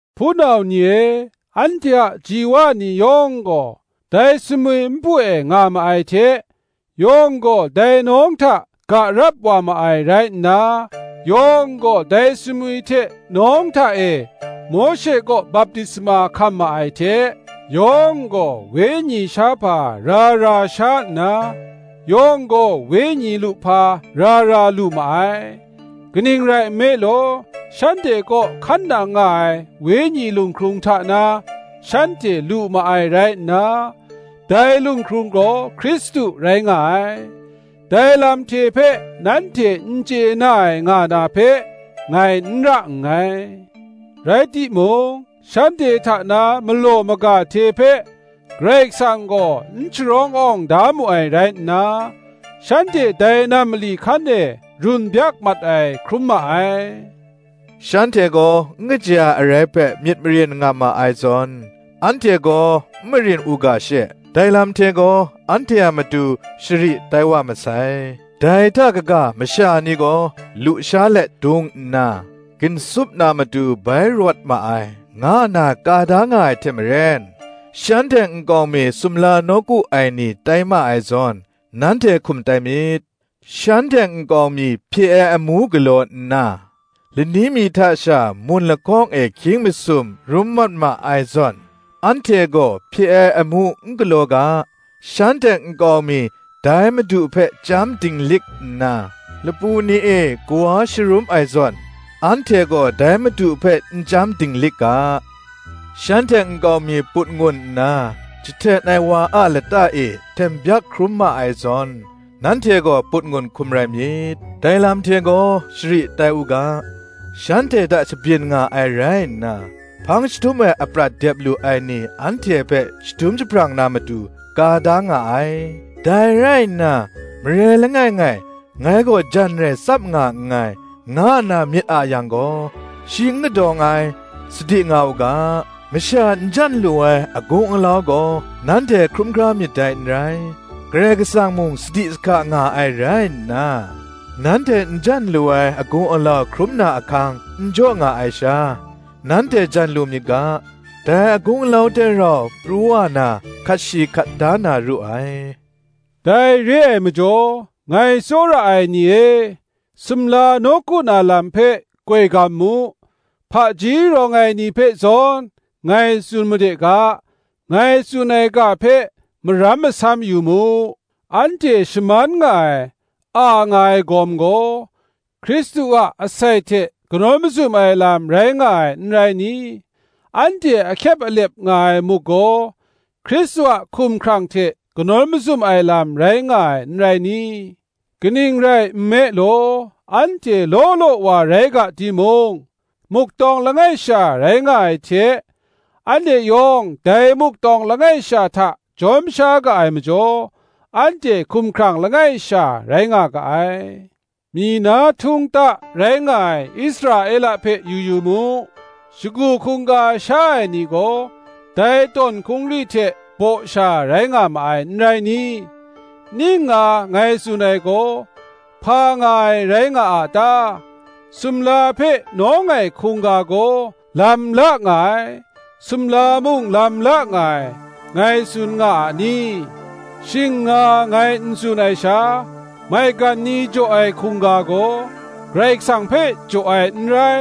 Hpunau ni e, anhte a ji wa ni yawng gaw, dai sumwi npu e nga ma ai hte, yawng gaw dai nawng hta ga rap wa ma ai rai nna, yawng gaw dai sumwi hte nawng hta e Mawshe kaw baptisma hkam ma ai hte, yawng gaw wenyi shahpa ra ra sha nna, yawng gaw wenyi luhpa ra ra lu ma ai: kaning rai nme law, shanhte kaw hkan nang nga ai wenyi lunghkrung hta na, shanhte lu ma ai rai nna, dai lunghkrung gaw Hkristu rai nga ai; dai lam hte hpe nanhte n chye na ai nga na hpe, ngai n ra nngai. Rai timung, shanhte hta na malaw maga hte hpe Karai Kasang gaw n sharawng awng da mu ai rai nna, shanhte dai nam mali hkan e run byak mat ai hkrum ma ai. Shanhte gaw n kaja ai arai hpe myit marin nga ma ai zawn, anhte gaw n marin u ga she, dai lam hte gaw anhte matu shari tai wa masai. Dai hta kaga, Masha ni gaw lu sha let dung nna, ginsup na matu bai rawt ma ai, nga nna ka da nga ai hte maren, shanhte nkau mi sumla nawku ai ni tai ma ai zawn, nanhte hkum tai myit. Shanhte nkau mi hpye ai amu galaw nna, lani mi hta sha mun lahkawng e hkying masum rum mat ma ai zawn, anhte gaw hpye ai amu n galaw ga. Shanhte nkau mi dai Madu hpe chyam dinglik nna, lapu ni e kawa sharum ai zawn, anhte gaw dai Madu hpe n chyam dinglik ga. Shanhte nkau mi put ngun nna, jahten ai wa a lata e hten byak hkrum ma ai zawn, nanhte gaw put ngun hkum rai myit. Dai lam hte gaw shari tai u ga, shanhte hta shabyin nga ai rai nna, hpang jahtum ai aprat dep lu ai ni anhte hpe shadum jahprang na matu, ka da nga ai. Dai rai nna, marai langai ngai, Ngai gaw jan rai tsap nga nngai, nga nna myit a yang gaw, shi n kadawng ai, sadi nga u ga. Masha n jan lu ai agung alau gaw nanhte hkrum hkra myit dai n rai; Karai Kasang mung sadi sahka nga ai rai nna, nanhte n jan lu ai agung alau hkrum na ahkang n jaw nga ai sha, nanhte jan lu myit ga, dai agung alau hte rau pru wa na hkat shi hkat da na ru ai. Dai re ai majaw, ngai tsawra ai ni e, sumla nawku na lam hpe koi gam mu. Hpaji rawng ai ni hpe zawn ngai tsun made ga; ngai tsun ai ga hpe maram masam yu mu. Anhte shaman nga ai, a nga ai gawm gaw, Hkristu a asai hte kanawn mazum ai lam rai nga ai, n rai ni? anhte ahkyep alep nga ai muk gaw, Hkristu a hkumhkrang hte kanawn mazum ai lam rai nga ai, n rai ni? Kaning rai nme law, anhte law law wa rai ga timung, muk tawng langai sha rai nga ai hte, anhte yawng dai muk tawng langai sha hta jawm sha ga ai majaw, anhte hkumhkrang langai sha rai nga ga ai. Myi na htung ta rai nga ai Israela hpe yu yu mu: shagu hkungga sha ai ni gaw, dai tawn hkungri hte baw sha rai nga ma ai, n rai ni? Ning nga ngai tsun ai gaw, hpa nga ai rai nga a ta? Sumla hpe nawng ai hkungga gaw lam la nga ai, sumla mung lam la nga ai, ngai tsun nga a ni? Shing nga ngai n tsun ai sha, maigan ni jaw ai hkungga gaw, Karai Kasang hpe jaw ai n rai,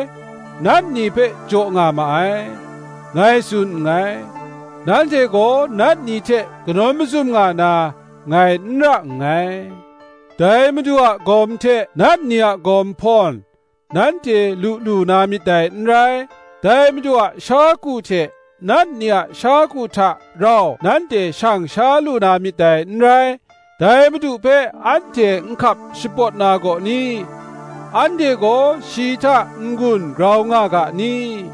nat ni hpe jaw nga ma ai, ngai tsun nngai: nanhte gaw nat ni hte kanawn mazum nga na, ngai n ra nngai. Dai Madu a gawm hte nat ni a gawm hpawn, nanhte lu lu na myit dai n rai; dai Madu a sha ku hte nat ni a sha ku hta rau nanhte shang sha lu na myit dai n rai. Dai Madu hpe anhte nhkap shapawt na gaw ni? anhte gaw shi hta n-gun grau nga ga ni?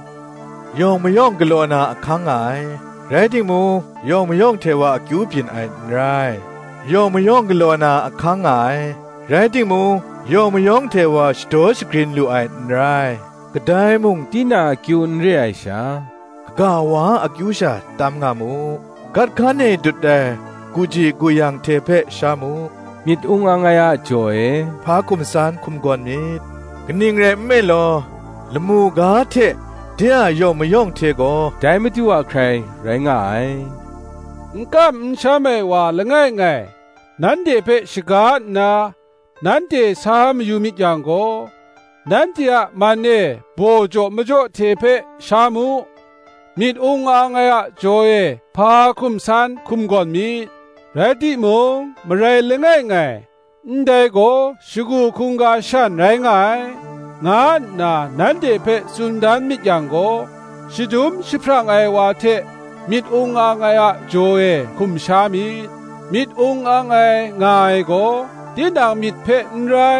Yawng mayawng galaw na ahkang nga ai; rai timung, yawng mayawng hte wa akyu byin ai n rai; yawng mayawng galaw na ahkang nga ai; rai timung, yawng mayawng hte wa shadaw shagrin lu ai n rai. Kadai mung tinang akyu n re ai sha, kaga wa a akyu sha tam nga mu. Gat hkan e dut ai guji guyang hte hpe sha mu, myit ung ang ai a jaw e hpa hkum san hkum gawn myit: kaning rai nme law, lamu ga hte de a yawng mayawng hte gaw dai Madu a hkrai rai nga ai. N kam n sham ai wa langai ngai, nanhte hpe shaga nna, nanhte sa mayu myit yang gaw, nanhte a man e baw jaw majaw hte hpe sha mu; myit ung ang ai a jaw e hpa hkum san hkum gawn myit. Rai timung, marai langai ngai, Ndai gaw shagu hkungga shan rai nga ai, nga nna nanhte hpe tsun dan myit yang gaw, shadum jahprang ai wa hte myit ung ang ai a jaw e hkum sha myit. Myit ung ang ai nga ai gaw, tinang myit hpe n rai,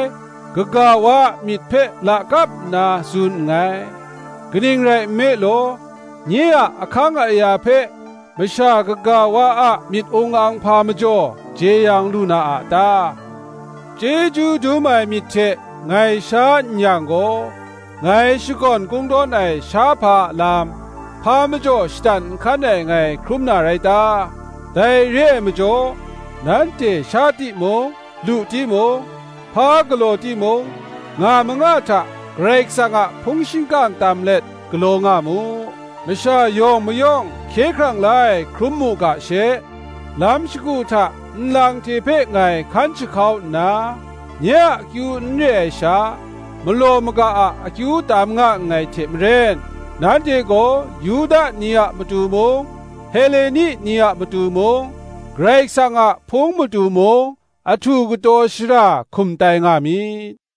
kaga wa a myit hpe lakap nna tsun nngai; kaning rai nme law, nye a ahkang aya hpe masha kaga wa a myit ung ang hpa majaw jeyang lu na a ta? Chyeju dum ai myit hte ngai sha n yang gaw, ngai shakawn kungdawn ai shahpa a lam, hpa majaw shatan nhkan ai ngai hkrum na rai ta? Dai re ai majaw, nanhte sha timung, lu timung, hpa galaw timung, nga manga hta Karai Kasang a hpung shingkang tam let, galaw nga mu. Masha yawng mayawng hkye hkrang la ai hkrum mu ga she, lam shagu hta nlang hte hpe ngai hkan jahkau nna, nye a akyu n re ai sha, malaw maga a akyu tam nga nngai hte maren, nanhte gaw Yuda ni a matu mung, Heleni ni a matu mung, Karai Kasang a Hpung matu mung, ahtu kataw shara hkum tai nga myit.